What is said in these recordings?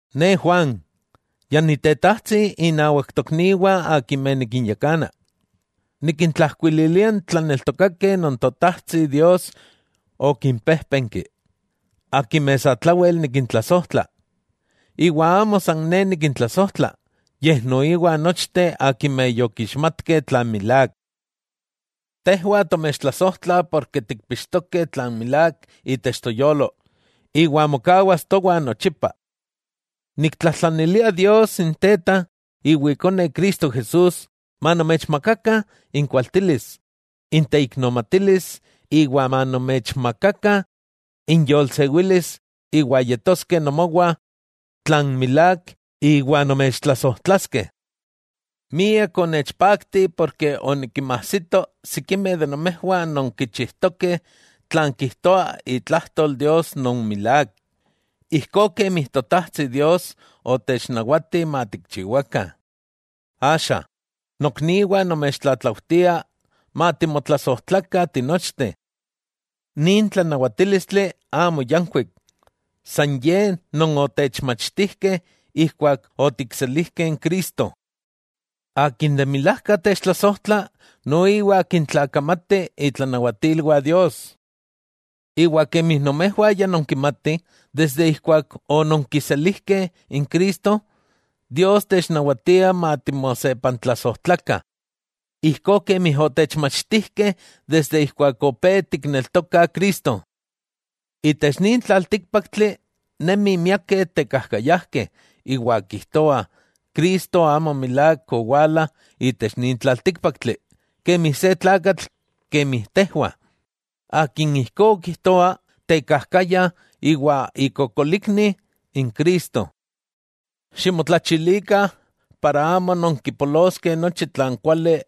Ne Juan, ya ni tetajtsi innawak tokniwah akimeh nikinyakana. Nikintlajkuililia n tlaneltokakeh non Totajtsi Dios okinpéjpenki, akimeh satlawel nikintlasojtla, iwa amo san ne nikintlasojtla, yej noiwa nochteh akimeh yokixmatkeh tlan milák. Tejwah tomechtlasojtlah porke tikpixtokeh tlan milák itech toyolo, iwa mokawas towah nochipa. Niktlajtlanilia Dios n Teta, iwa Ikone Cristo Jesús, manomechmakakah inkualtilis, inteiknomatilis iwa manomechmakakah inyolsewilis iwa yetoskeh nomowah tlan milák iwa nomechtlasojtlaskeh. Miak onechpakti porke onikinmajsito sikimeh de nomejwah non kichijtokeh tlan kijtoah itlajtol Dios non milák, ijkó kemi Totajtsi Dios otechnawatih matikchiwakah. Axa, nokniwah nomechtlatlaujtia matimotlasojtlakah tinochteh. Nin tlanawatílistli amo yankuik, san ye non otechmachtijkeh ijkuak otikselijkeh n Cristo. Akin de milajka techtlasojtla noiwa kintlakamati itlanawatilwah Dios. Iwa kemi nomejwah ya nonkimatih desde ijkuak ononkiselijkeh n Cristo, Dios technawatia matimosepantlasojtlakah, ijkó kemi otechmachtijkeh desde ijkuak opé tikneltokah Cristo. Itech nin tlaltíkpaktli nemih miakeh tekajkayajkeh, iwa kijtoah Cristo amo milák owala itech nin tlaltíkpaktli kemi se tlakatl kemi tejwah. Akin ijkó kijtoa, tekajkaya iwa ikokolikni n Cristo. Ximotlachilikah, para amo nonkipoloskeh nochi tlan kuali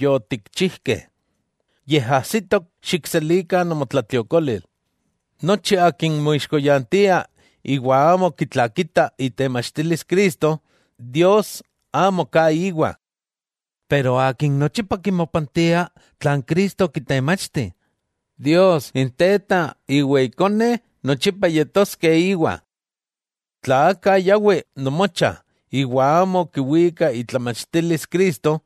yotikchijkeh, yej ajsitok xikselikah nomotlatliokolil. Nochi akin moixkoyantia iwa amo kitlakita itemachtilis Cristo, Dios amo ka íwa. Pero akin nochipa kimopantia tlan Cristo okitemachti, Dios n Teta iwa Ikone nochipa yetoskeh íwa. Tla aka yawi nomocha iwa amo kiwika itlamachtilis Cristo,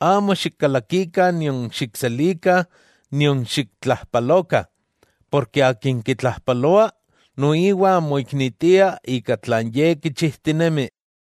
amo xikkalakikah nion xikselikah nion xiktlajpalokah, porke akin kitlajpaloa noiwa moiknitia ika tlan ye kichijtinemi.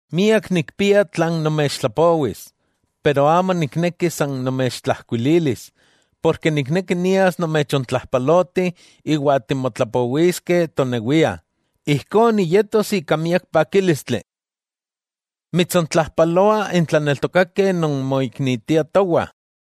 Miak nikpia tlan nomechtlapowis, pero amo nikneki san nomechtlajkuililis, porke nikneki nias nomechontlajpaloti iwa timotlapowiskeh tonewiah, ijkó niyetos ika miak pakílistli. Mitsontlajpaloah n tlaneltokakeh non moiknitiah towah.